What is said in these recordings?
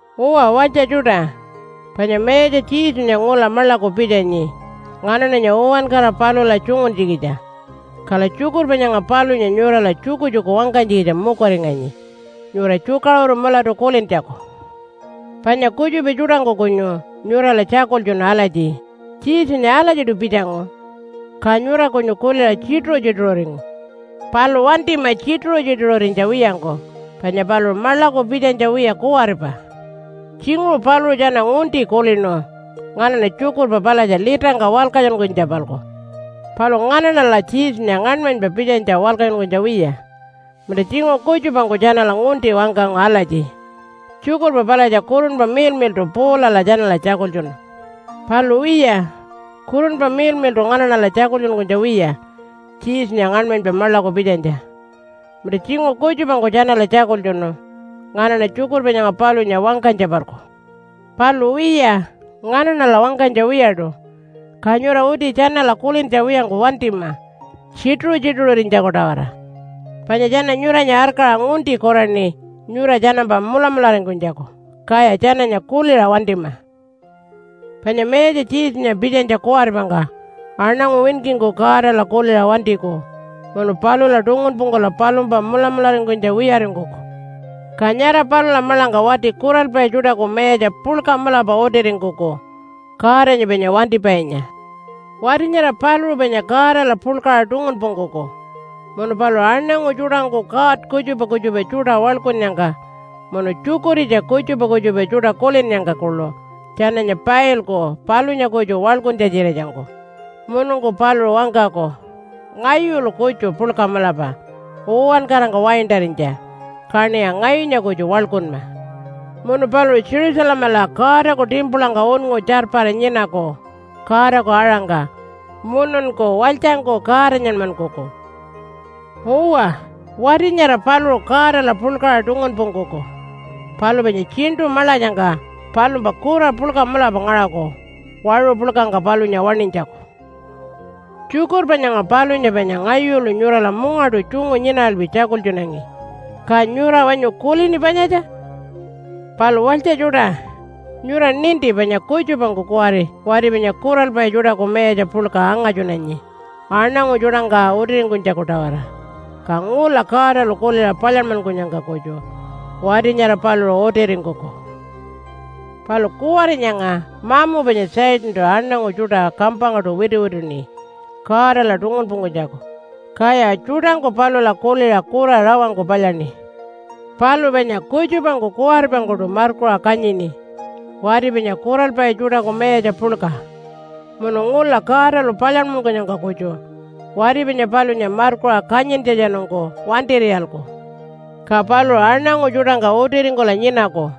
Uwa walytja tjuṯa, panya Mayatja Jesunya ngula maḻaku pitjanyi nganaṉanya uwankara palula tjunguntjikitja. Kala tjukurpa nyanga palunya nyurala tjukutjuku wangkanytjikitja mukuringanyi nyura tjukaṟuru mulatu kulintjaku. Panya kutjupa tjuṯangku kunyu nyurala tjakultjunu alatji, “Jesunya alatjiṯu pitjangu.” Ka nyura kunyu kuliṟa tjituṟu-tjituṟuringu. Palu wantima tjituṟu-tjituṟurinytja wiyangku panya paluṟu maḻaku pitjanytja wiya kuwaripa. Tjinguṟu paluṟu tjana ngunti kulinu nganaṉa tjukurpa palatja litangka walkatjunkunytja-palku, palu nganaṉala Jesunya ngaṉmanypa pitjanytja walkatjunkunytja wiya. Munta tjinguṟu kutjupangku tjanala ngunti wangkangu alatji, “Tjukurpa palatja Kurunpa Miḻmiḻṯu Paulala tjanala tjakultjunu.” Palu wiya Kurunpa Miḻmiḻṯu nganaṉala tjakultjunkunytja wiya Jesunya ngaṉmanypa maḻaku pitjanytja. Munta tjinguṟu kutjupangku tjanala tjakultjunu nganaṉa tjukurpa nyanga palunya wangkanytja-palku. Palu wiya, nganaṉala wangkanytja wiyaṯu. Ka nyura uti tjanala kulintja wiyangku wantima tjituṟu-tjituṟurinytjaku-tawara. Panya tjana nyuranya arkaṟa ngunti kuraṉi nyura tjanampa mulamularingkunytjaku, kaya tjananya kuliṟa wantima. Panya Mayatja Jesunya pitjanytja kuwaripangka aṉangu winkingku Godala kuliṟa wantiku munu palula tungunpungkula palumpa mulamularingkunytja wiyaringkuku. Ka nyara palula maḻangka wati kuralpai tjuṯaku mayatja puḻka mulapa utiringkuku Godanya panya wantipainya. Wati nyara paluṟu panya Godala puḻkaṟa tungunpungkuku, munu paluṟu aṉangu tjuṯangku god kutjupa kutjupa tjuṯa waḻkunnyangka munu tjukuritja kutjupa kutjupa tjuṯa kulinnyangka kuḻu tjananya pailku palunya kutju waḻkuntja-tjiratjangku. Mununku paluṟu wangkaku, “Ngayulu kutju puḻka mulapa uwankarangka waintarinytja, kaṉiya ngayunya kutju waḻkunma.” Munu paluṟu Jerusalemala Godaku timpulangka unngu tjarpara nyinaku Godaku aṟangka mununku walytjangku Godanyanmankuku. Uwa, wati nyara paluṟu Godala puḻkaṟa tungunpungkuku, palu panya tjiṉṯu maḻatjangka palumpa kura puḻka mulapa ngaṟaku waṟu puḻkangka palunya waṉinytjaku. Tjukurpa nyanga palunya panya ngayulu nyurala mungaṯu tjungu nyinaralpi tjakultjunangi, ka nyura wanyu kulini panyatja? Palu walytja tjuṯa, nyura ninti panya kutjupangku kuwari wati panya kuralpai tjuṯaku mayatja puḻka angatjunanyi aṉangu tjuṯangka utiringkunytjaku-tawara. Ka ngula Godalu kuliṟa palyanmankunyangka kutju wati nyara paluṟu utiringkuku. Palu kuwari nyanga mamu panya Satantu aṉangu tjuṯa kampangkaṯu wituwituṉi Godala tungunpungkunytjaku, kaya tjuṯangku palula kuliṟa kura rawangku palyaṉi. Palu panya kutjupangku kuwaripangkuṯu markuṟa kanyini wati panya kuralpai tjuṯaku mayatja puḻka. Munu ngula Godalu palyanmankunyangka kutju wati panya palunya markuṟa kanyintjatjanungku wantir'iyalku, ka paluṟu aṉangu tjuṯangka utiringkula nyinaku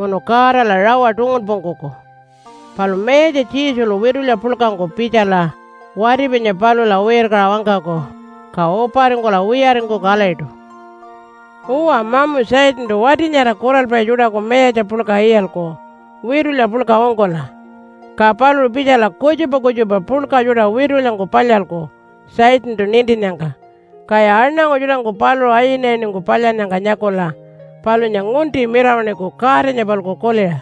munu Godala rawa tungunpungkuku. Palu Mayatja Jesulu witulya puḻkangku pitjala wati panya palula wirkaṟa wangkaku, ka uparingkula wiyaringkuku alatjiṯu. Uwa, mamu Satantu wati nyara kuralpai tjuṯaku mayatja puḻka iyalku witulya puḻka ungkula. Ka paluṟu pitjala kutjupa kutjupa puḻka tjuṯa witulyangku palyalku Satantu nintinnyangka. Kaya aṉangu tjuṯangku paluṟu ayinayiningku palyannyangka nyakula palunya ngunti mirawaṉiku Godanya-palku kuliṟa.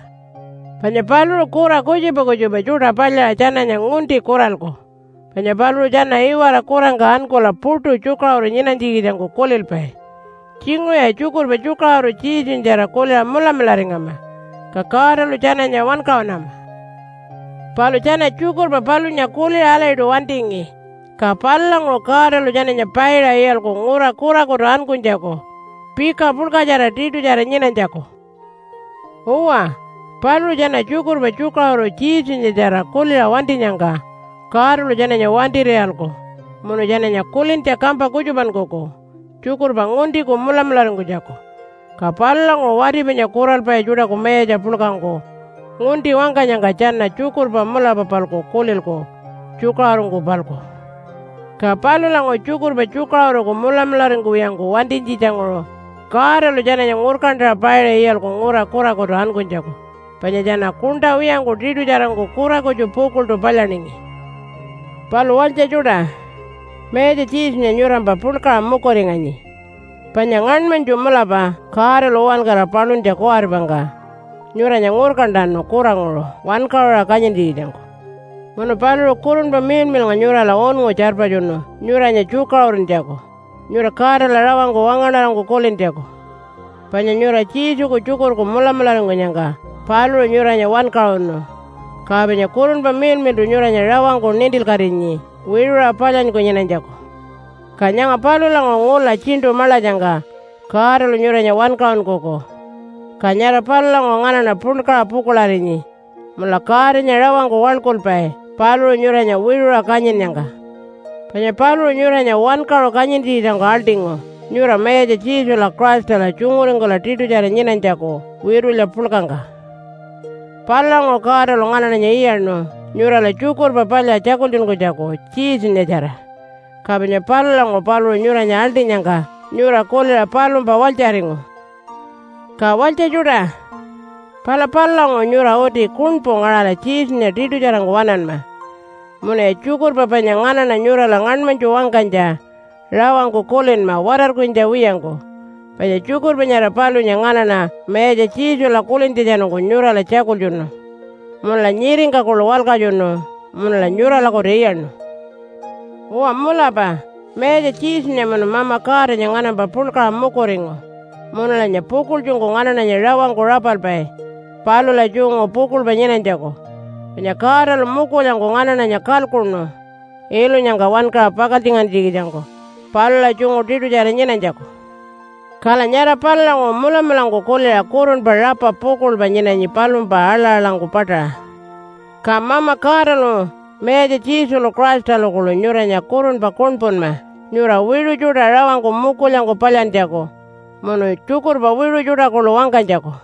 Panya paluṟu kura kutjupa kutjupa tjuṯa palyaṟa tjananya ngunti kuralku, panya paluṟu tjana iwara kurangka ankula puṯu tjukaṟuru nyinanytjikitjangku kulilpai. Tjinguṟuya tjukurpa tjukaṟuru Jesunyatjara kuliṟa mulamularingama, ka Godalu tjananya wankaṟunama. Palu tjana tjukurpa palunya kuliṟa alatjiṯu wantingi, ka palulanguṟu Godalu tjananya paiṟa iyalku ngura kurakutu ankunytjaku pika puḻkatjara tiṯutjara nyinanytjaku. Uwa, paluṟu tjana tjukurpa tjukaṟuru Jesunyatjara kuliṟa wantinyangka Godalu tjananya wantir'iyalku munu tjananya kulintja kampa kutjupankuku tjukurpa nguntiku mulamularingkunytjaku, ka palulanguṟu wati panya kuralpai tjuṯaku mayatja puḻkangku ngunti wangkanyangka tjana tjukurpa mulapa-palku kulilku tjukaṟurungku-palku. Ka palulanguṟu tjukurpa tjukaṟuruku mulamularingkuwiyangku wantinytjitjanguṟu Godalu tjananya ngurkantaṟa paiṟa iyalku ngura kurakutu ankunytjaku, panya tjana kuṉṯa wiyangku tiṯutjarangku kura kutju pukuḻṯu palyaningi. Palu walytja tjuṯa, Mayatja Jesunya nyurampa puḻkaṟa mukuringanyi. Panya ngaṉmanytju mulapa Godalu uwankara paluntja kuwaripangka nyuranya ngurkantanu kuranguṟu wankaṟuṟa kanyintjikitjangku. Munu paluṟu Kurunpa Miḻmiḻnga nyurala unngu tjarpatjunu nyuranya tjukaṟuruntjaku, nyura Godala rawangku wangaṉarangku kulintjaku. Panya nyura Jesuku tjukurku mulamularingkunyangka paluṟu nyuranya wankaṟunu, ka panya Kurunpa Miḻmiḻṯu nyuranya rawangku nintilkatinyi wiṟuṟa palyanyku nyinanytjaku. Ka nyanga palulanguṟu ngula tjiṉṯu maḻatjangka Godalu nyuranya wankaṟunkuku. Ka nyara palulanguṟu nganaṉa puḻkaṟa pukuḻarinyi munula Godanya rawangku waḻkulpai paluṟu nyuranya wiṟuṟa kanyinnyangka. Panya paluṟu nyuranya wankaṟu kanyintjikitjangku aḻṯingu nyura Mayatja Jesula Christala tjunguringkula tiṯutjara nyinanytjaku witulya puḻkangka. Palulanguṟu Godalu nganaṉanya iyaṉu nyurala Tjukurpa Palya tjakultjunkunytjaku Jesunyatjara. Ka panya palulanguṟu paluṟu nyuranya aḻṯinyangka nyura kuliṟa palumpa walytjaringu. Ka walytja tjuṯa, pala palulanguṟu nyura uti kuṉpu ngaṟala Jesunya tiṯutjarangku waṉanma. Munuya tjukurpa panya nganaṉa nyurala ngaṉmanytju wangkanytja rawangku kulinma watarkurinytja wiyangku. Panya tjukurpa nyara palunya nganaṉa Mayatja Jesula kulintjatjanungku nyurala tjakultjunu munula nyiringka kuḻu walkatjunu munula nyuralakutu iyaṉu. Uwa mulapa Mayatja Jesunya munu Mama Godanya nganampa puḻkaṟa mukuringu munulanya pukuḻtjungku nganaṉanya rawangku rapalpai palula tjungu pukuḻpa nyinanytjaku. Panya Godalu mukulyangku nganaṉanya kalkuṉu ilunyangka wankaṟa pakaltjingantjikitjangku palula tjungu tiṯutjara nyinanytjaku. Kala nyara palulanguṟu mulamulangku kuliṟa kurunpa rapa pukuḻpa nyinanyi palumpa aḻa-aḻangku paṯaṟa. Ka Mama Godalu Mayatja Jesulu Christalu kuḻu nyuranya kurunpa kuṉpunma nyura wiṟu tjuṯa rawangku mukulyangku palyantjaku munu tjukurpa wiṟu tjuṯa kuḻu wangkanytjaku.